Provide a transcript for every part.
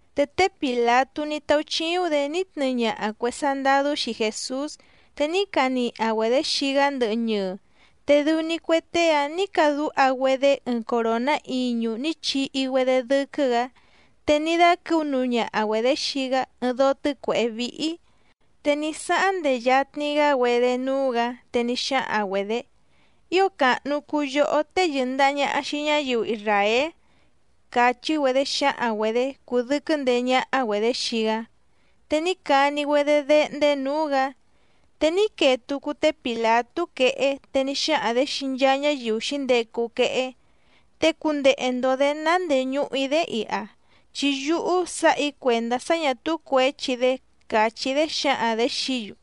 Te té Pìlatú ní táúchíúⁿ‑dě ní tnɨɨ ñaha cuè sandadú xii Jèsús, te ní caniha‑güedě xii‑gá ndɨhɨ ñɨɨ. Te dɨu‑ni cue tée‑áⁿ nǐ cadúha‑güedé ɨɨⁿ coròná iñu ní chihi‑güedé dɨ́quɨ́‑gǎ, te ní dáquɨ̌u nuu ñaha‑güedě xii‑gá ɨɨⁿ dóó tɨ́cuèhé víhí. Te ní sáháⁿ ndehe yatni‑gá‑güedé núú‑gǎ, te ní xáhaⁿ‑güedě: —¡Ío càhnu cuu yohó tée yɨ̀ndaha ñaha xii ñáyiu isràél! —càchí‑güedé xǎhaⁿ‑güedě cúdɨ̀quɨ́ ndeé ñáhá‑güedě xii‑gá. Te ní cani‑güedé déhndé nǔú‑gǎ. Te ní quee tucu té Pìlatú quehé te ní xáhaⁿ‑dě xii nchaa ñáyiu xǐndecu quehé: —Te cundehe‑ndo‑dě ná ndéé ñùhu‑í‑dé iha, chi yúhú sǎha‑í cuèndá sá ñà túú cuěchi‑dé —càchí‑dé xǎhaⁿ‑dě xií‑yu.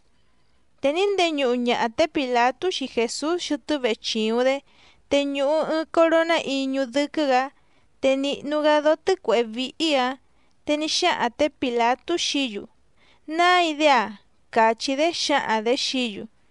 Te ní ndeñuhu ñaha té Pìlatú xii Jèsús xɨtɨ́ vechìuⁿ‑dé te ñùhu ɨɨⁿ coroná iñu dɨ́quɨ́‑gǎ, te nìhnu‑gá dóó tɨ́cuèhé víhí‑ǎⁿ. Te ní xáhaⁿ tě Pìlatú xií‑yu: —¡Nái‑dé‑a! —càchí‑dé xǎhaⁿ‑dě xií‑yu.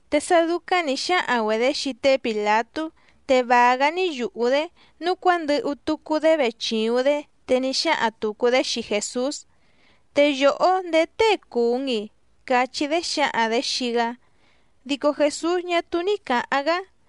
Te sá dúcáⁿ nǐ xáhaⁿ‑güedě xii té Pìlatú, te vàa‑gá ní yùhú‑dé. Núu cuándɨhu tucu‑dé vechìuⁿ‑dé, te ní xáhaⁿ tùcu‑dé xii Jèsús: —¿Te yòhó ndèé tée cùu‑n‑i? —cachí‑dé xǎhaⁿ‑dě xii‑gá. Dico Jèsús ñá túú ní cǎháⁿ‑gá.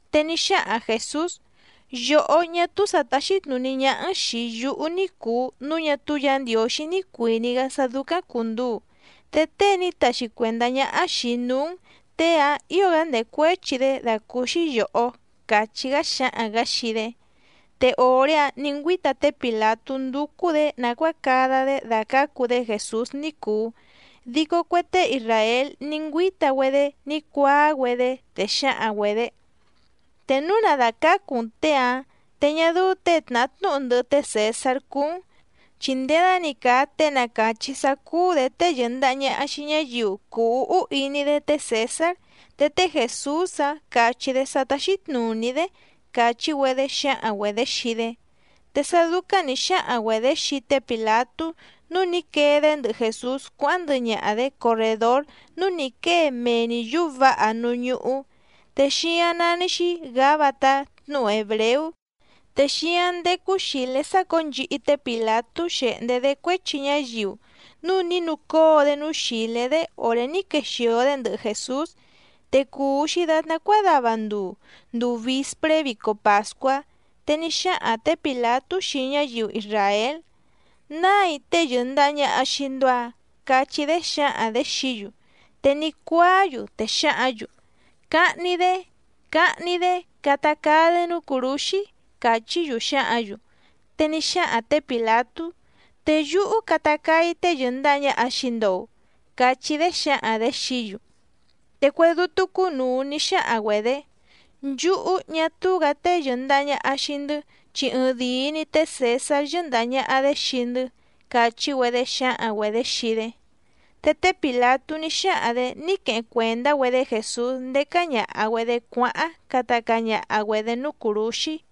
Te ní xáhaⁿ Jèsús: —Yòhó ñá túú sǎ táxí tnùní ñáhá‑n xìi yúhú ní cùu núu ñá túú Yǎ Ndiǒxí ní cuìní‑gá sá dúcáⁿ cùnduu, te tée ní taxi cuèndá ñáhá xìi‑í núú‑n těe‑áⁿ ǐo‑gá ndècuéchi‑dé dàcúúxí yòhó —càchí‑gá xáhaⁿ‑gǎ xii‑dé. Te òré‑áⁿ nǐ ngüíta té Pìlatú ndúcú‑dě nàcuáa cada‑dé dàcácu‑dé Jèsús ní cùu, dico cue tée isràél ní ngüíta‑güedé ní cuáá‑güedé, te xǎhaⁿ‑güedě: —Te núu na dàcácu‑n těe‑áⁿ, te ñá dɨ́ú těe tnàhá tnúhu ndɨhɨ té Cèsár cúú‑n. Chi nděda‑ni càa tée na càchí sá cúú‑dě tée yɨ̀ndaha ñaha xii ñáyiu cùu úhú iní‑dé té Cèsár. Te té Jèsús‑áⁿ càchí‑dé sá táxí tnùní‑dé —càchí‑güedé xǎhaⁿ‑güedě xii‑dé. Te sá dúcáⁿ nǐ xáhaⁿ‑güedě xii té Pìlatú nǔu ní quee‑dé ndɨhɨ Jèsús cuáháⁿ ndɨhɨ ñaha‑dě corrèdór núú nǐ quée mee‑ni yǔú vǎha núú ñúhú, te xíáⁿ nání‑xí Gǎbatá tnúhu hèbreú. Te xíáⁿ ndécú xìlé sácǒo nchihi té Pìlatú xèhndé‑dé cuéchi ñáyiu, núu ní nucóo‑dé núú xìlé‑dé òré ní quexìo‑dé ndɨhɨ Jèsús. Te cùu‑xi datná cuádava nduu, nduu vìspré vico pàscuá. Te ní xáhaⁿ tě Pìlatú xii ñáyiu isràél: —¡Nái tée yɨ̀ndaha ñaha xii‑ndo‑a! —cachí‑dé xǎhaⁿ‑dě xií‑yu. Te ní cuáá‑yu, te xǎhǎⁿ‑yu: —¡Cahni‑dé! ¡Cahni‑dé! ¡Cata caa‑dé núú cùrúxí! —càchí‑yu xǎhǎⁿ‑yu. Te ní xáhaⁿ tě Pìlatú: —¿Te yúhú cata caa‑í tée yɨ̀ndaha ñaha xii‑ndo‑u? —cachí‑dé xǎhaⁿ‑dě xií‑yu. Te cue dútú cúnùu ní xáhaⁿ‑güedě: —Nchúhú ñá túú‑gǎ tée yɨ̀ndaha ñaha xii‑ndɨ́, chi ɨɨⁿdìi‑ni té Cèsár yɨ́ndàha ñaha‑dé xii‑ndɨ́ —càchí‑güedé xǎhaⁿ‑güedě xii‑dé. Te té Pìlatú ní xáhaⁿ‑dě ní queheⁿ cuèndá‑güedé Jèsús ndécá ñàha‑güedé cuáháⁿ cata caa ñaha‑güedě núú cùrúxí.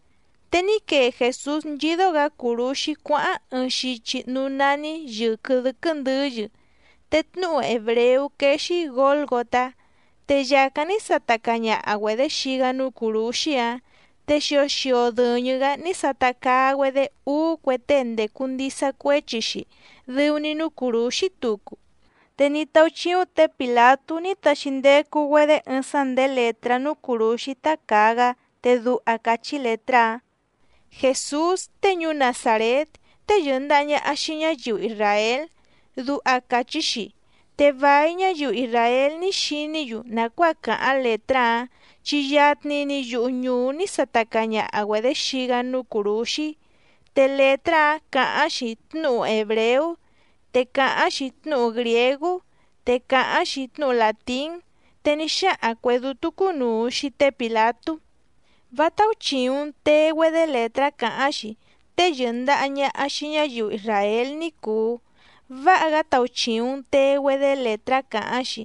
Te ní quee Jèsús nchídó‑gǎ cùrúxí cuáháⁿ ɨɨⁿ xichi núú nání Yɨ̀quɨ Dɨ́quɨ́ Ndɨ̌yɨ. Te tnúhu hèbreú quéé‑xí Gǒlgotá. Te yàcáⁿ ní sata caa ñaha‑güedě xii‑gá núú cùrúxí‑áⁿ. Te xio xio dɨ̀ñɨ‑gá ní sata caa‑güedé úú cue tée ndècu ndisa cuéchi‑xi dɨu‑ni núú cùrúxí tucu. Te ní táúchíúⁿ tě Pìlatú ní taxi ndecu‑güedé ɨɨⁿ sá ndèé lètrá núú cùrúxí tá càa‑gá, te duha càchí lètrá‑áⁿ: “Jèsús tée ñuú Nazàrét, tée yɨ̀ndaha ñaha xii ñáyiu isràél”, duha càchí‑xi. Te vài ñáyiu isràél ní xiní‑yu nàcuáa càháⁿ lètrá‑áⁿ, chi yatni‑ni yuhu ñùú ní sata caa ñaha‑güedě xii‑gá núú cùrúxí. Te lètrá‑áⁿ càháⁿ‑xi tnúhu hèbreú, te càháⁿ‑xi tnúhu grìégú, te càháⁿ‑xi tnúhu làtín. Te ní xáhaⁿ cuè dútú cúnùu xii té Pìlatú: —Vá táúchìuⁿ‑n tee‑güedé lètrá cáháⁿ‑xi “Tée yɨ̀ndaha ñaha xii ñáyiu isràél” ní cùu, váha‑gá tauchìuⁿ‑n tee‑güedé lètrá cáháⁿ‑xi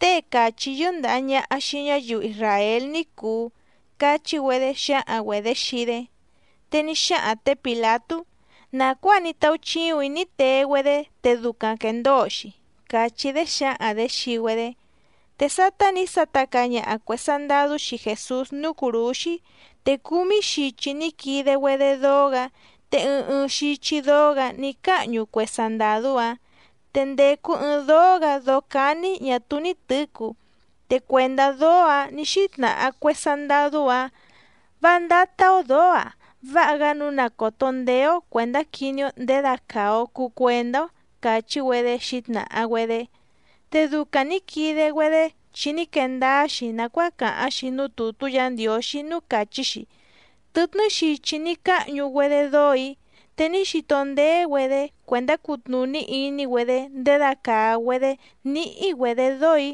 “Tée càchí yɨ́ndàha ñaha xii ñáyiu isràél ní cùu” —cachí‑güedé xǎhaⁿ‑güedě xii‑dé. Te ní xáhaⁿ tě Pìlatú: —Nàcuáa ní táúchíùⁿ‑í ní tee‑güedé te ducaⁿ quèndóo‑xi —càchí‑dé xǎhaⁿ‑dě xii‑güedé. Te sátá nǐ sata caa ñaha cuè sandadú xii Jèsús núú cùrúxí, te cúmí xichi ní quide‑güedé dóó‑gǎ, te ɨɨⁿ ɨɨⁿ xichi dóó‑gǎ ní cáhñu cue sandàdú‑áⁿ. Te ndècu ɨɨⁿ dóó‑gǎ dóó cání ñà túú ní tɨ̌cu. Te cuèndá dóó‑ǎⁿ nǐ xítnàha cue sandadú‑áⁿ: —Vá ndátá‑ó dǒó‑a, váha‑gá nǔu na còto ndéé‑ó cuèndá quiní‑ó ndědacàa‑o cuu cuendá‑ó —càchí‑güedé xǐtnàha‑güedé. Te ducaⁿ nǐ quide‑güedé chi ní quee ndáá‑xi nàcuáa càháⁿ‑xi núú tùtú Yǎ Ndiǒxí núú càchí‑xi: “Tɨtnɨ́ xichi ní cáhñu‑güedé dóò‑í. Te ní xito ndéé‑güedé cuèndá cutnùní iní‑güedé ndědacàa‑güedé níhí‑güedě dóò‑í”,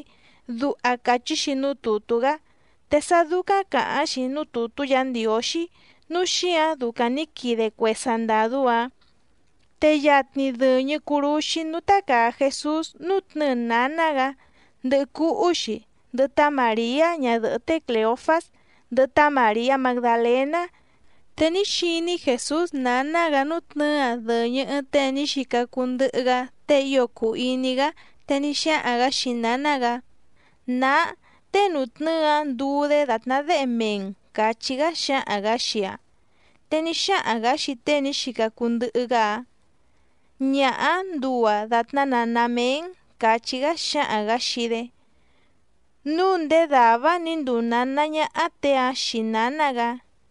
duha càchí‑xi núú tùtú‑gá. Te sá dúcáⁿ càháⁿ‑xi núú tùtú Yǎ Ndiǒxí nǔu xíǎⁿ ducaⁿ nǐ quide cue sandàdú‑áⁿ. Te yatni dɨ̀ñɨ curúxí núú tácàa Jesús nútnɨ̌ɨ nǎná‑gǎ, ndɨhɨ cúhú‑xi, ndɨhɨ tá Màriá ñadɨ̀hɨ́ té Clèofás, ndɨhɨ tá Màriá Magdalèná. Te ní xiní Jèsús nǎná‑gǎ nútnɨ̌ɨ‑aⁿ dɨ̀ñɨ ɨɨⁿ tée ní xica cuu ndɨhɨ‑gá, tée ío cùu iní‑gá, te ní xáhaⁿ‑gǎ xii nǎná‑gǎ: —Nǎá, tée nùtnɨ́ɨ‑áⁿ nduu‑dé dàtná déhe mee‑n —càchí‑gá xáhaⁿ‑gǎ xii‑aⁿ. Te ní xáhaⁿ‑gǎ xii tée ní xica cuu ndɨhɨ‑gá‑áⁿ: —Ñaha‑áⁿ nduu‑aⁿ dàtná nǎná méé‑n —càchí‑gá xáhaⁿ‑gǎ xii‑dé. Núu ndéé dàvá‑áⁿ nǐ nduu nǎná ñáhá těe‑áⁿ xii nǎná‑gǎ.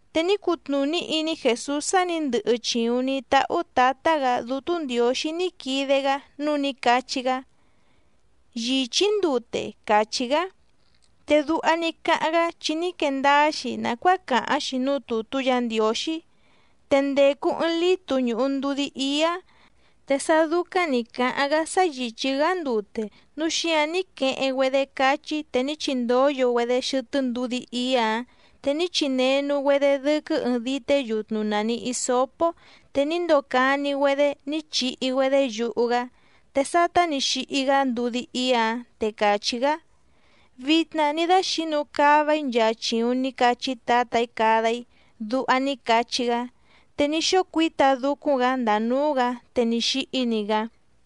Te ní cutnùní iní Jèsús sá nǐ ndɨhɨ chìuⁿ ní táhú Tǎtá‑gǎ Dútú Ndiǒxí ní quide‑gá nǔu ní cachí‑gá: —Yìchí‑í ndute —càchí‑gá. Te duha ní cáháⁿ‑gá chi ní quee ndáá‑xi nàcuáa càháⁿ‑xi núú tùtú Yǎ Ndiǒxí. Te ndècu ɨɨⁿ lítu ñùhu ndudí íá. Te sá dúcáⁿ nǐ cáháⁿ‑gá sá yìchí‑gá ndute, núu xíǎⁿ ní queheⁿ‑güedé cáchí te ní chindóyo‑güedé xɨtɨ́ ndudí íá‑ǎⁿ, te ní chinenu‑güedé dɨ́quɨ́ ɨɨⁿ dité yutnu nàni hisópó, te ní ndocani‑güedé ní chihi‑güedé yuhu‑gá. Te sátá nǐ xihi‑gá ndudí íá‑ǎⁿ, te càchí‑gá: —Vitna ní dáxǐnu cava‑í nchaa chìuⁿ ní cachí Tǎtà‑í cada‑í —duha ní cachí‑gá. Te ní xócuǐta dúcúⁿ‑gǎ ndàa núú‑gǎ, te ní xíhí‑ni‑gá.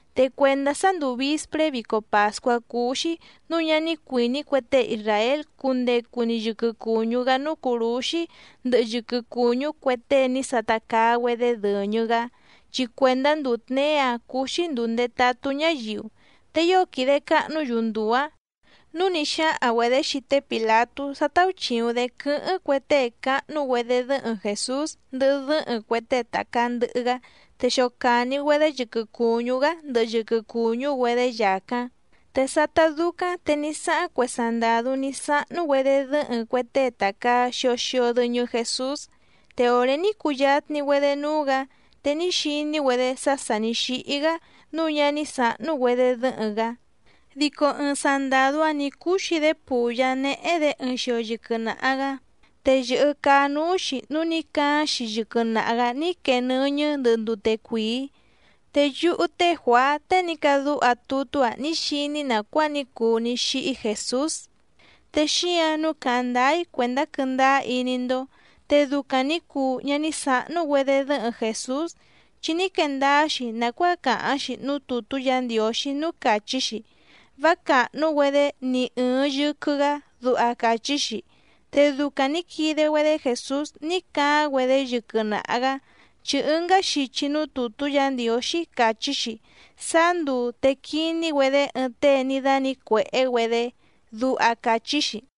Te cuèndá sá ndùu vispré vico pàscuá cúú‑xí nǔu ñá ní cuìní cue tée isràél cundecu‑ni yɨquɨ cùñú‑gá núú cùrúxí ndɨhɨ yɨquɨ cùñú cue tée ní sata caa‑güedé dɨ̀ñɨ‑gá, chi cuèndá nduu tněé‑áⁿ cúú‑xí ndùu ndetatú ñáyiu, te ío quìde cahnú‑yu nduu‑ǎⁿ, núu ní xáhaⁿ‑güedě xii té Pìlatú sá táúchìuⁿ‑dé quɨ́hɨ́ⁿ cue tée cáhnú‑güedé dɨ́hɨⁿ Jèsús ndɨhɨ dɨ́hɨⁿ cue tée tàcaa ndɨhɨ‑gá, te xocàni‑güedé yɨquɨ cùñú‑gá ndɨhɨ yɨquɨ cùñú‑güedé yàcáⁿ. Te sátá dúcáⁿ te ní sáháⁿ cue sandàdú ní sáhnú‑güedé dɨ́hɨⁿ cue tée tàcaa xio xio dɨñɨ Jesús. Te òré ní cuyatni‑güedé núú‑gǎ, te ní xiní‑güedé sá sà ní xíhí‑gá nǔu ñá ní sǎhnú‑güedé dɨ́hɨⁿ‑gá. Dico ɨɨⁿ sandàdú‑áⁿ nǐ cúxi‑dé pùyá néhé‑dě ɨɨⁿ xio yɨquɨ naha‑gǎ, te yɨ̀hɨ caá núú‑xi núu ní caáⁿ‑xi yɨquɨ naha‑gǎ ní quee nɨ́ñɨ́ ndɨhɨ ndute cuìí. Te yúhú té Juàá tée ní cadúha tutú‑a ní xiní‑í nàcuáa ní cuu ní xíhí Jèsús, te xíǎⁿ nǔu càháⁿ ndáá‑í cuèndá quɨ́ndáá iní‑ndó. Te ducaⁿ nǐ cuu ñá ní sǎhnú‑güedé dɨ́hɨⁿ Jèsús, chi ní quee ndáá‑xi nàcuáa càháⁿ‑xi núú tùtú Yǎ Ndiǒxí núú càchí‑xi: “Vá càhnú‑güedé ni ɨ̀ɨⁿ yɨquɨ‑gá”, duha càchí‑xi. Te ducaⁿ nǐ quide‑güedé Jèsús ní caáⁿ‑güedé yɨquɨ naha‑gǎ, chi ɨngá xichi núú tùtú Yǎ Ndiǒxí càchí‑xi: “Sáá nduu te quiní‑güedé ɨɨⁿ tée ní dánǐcuèhé‑güedé”, duha càchí‑xi.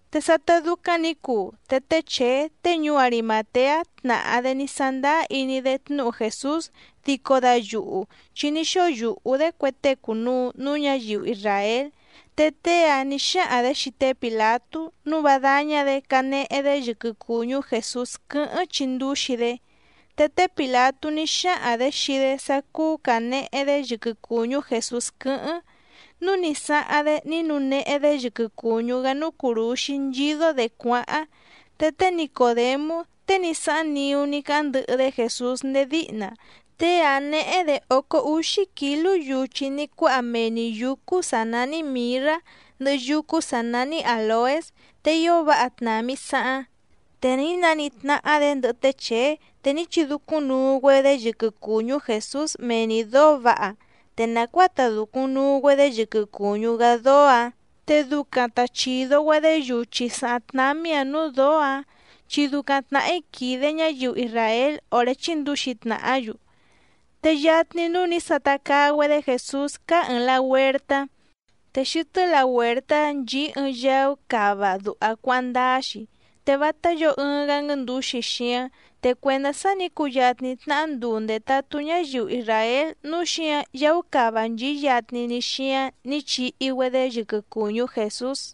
Te sátá dúcáⁿ nǐ cuu, te té Chèé tée ñuú Arimàteá tnàhá‑dé ní sándáá iní‑dé tnúhu Jèsús dico dayuhu, chi ní xóo yùhú‑dé cue tée cùnuu núú ñǎyiu isràél. Te tée‑áⁿ nǐ xáhaⁿ‑dě xii té Pìlatú nǔu vá dáñá‑dě canehe‑dé yɨquɨ cùñú Jèsús quɨ́hɨ́ⁿ chindúxi‑dé, te té Pìlatú ní xáhaⁿ‑dě xii‑dé sá cúú cànehe‑dé yɨquɨ cùñú Jèsús quɨ́hɨ́ⁿ, núu ní sáháⁿ‑dé ní nuu nehe‑dé yɨquɨ cùñú‑gá núú cùrúxí nchídó‑dě cuáháⁿ. Te té Nicòdemú tée ní sáháⁿ niú ní cáháⁿ ndɨhɨ‑dé Jèsús ndéé díhna, tée‑áⁿ néhé‑dě ócó úxí kǐlú yuchi ní cuáha mee‑ni yǔcú sǎ nání mìrrá ndɨhɨ yúcú sǎ nání àloés. Te ío váha tnàmi saháⁿ. Te ní naníhí tnáhá‑dě ndɨhɨ té Chèé, te ní chidúcúⁿnuu‑güedé yɨquɨ cùñú Jèsús mee‑ni dǒó vǎha, te nàcuáa ta dùcuⁿ nuu‑güedé yɨquɨ cùñú‑gá dóó‑ǎⁿ, te ducaⁿ ta chìdo‑güedé yuchi sàháⁿ tnámí‑ǎⁿ nǔú dǒó‑ǎⁿ chi ducaⁿ tnàhí quìde ñáyiu isràél òré chíndǔxi tnàhá‑yu. Te yatni núú nǐ sata caa‑güedé Jèsús cáá ɨ̀ɨⁿ lahuertá. Te xɨtɨ́ lahuèrtá‑áⁿ nchìí ɨɨⁿ yaú cava duha cuáháⁿ ndáá‑xi, te vátá yǒo ɨɨⁿ‑gá nguɨ́ndǔxi xíáⁿ. Te cuèndá sá nǐ cuyatni tnahá nduu ndètatú ñáyiu isràél nǔu xíǎⁿ yaú cava nchìí yatni‑ni xíáⁿ nǐ chihi‑güedé yɨquɨ cùñú Jèsús.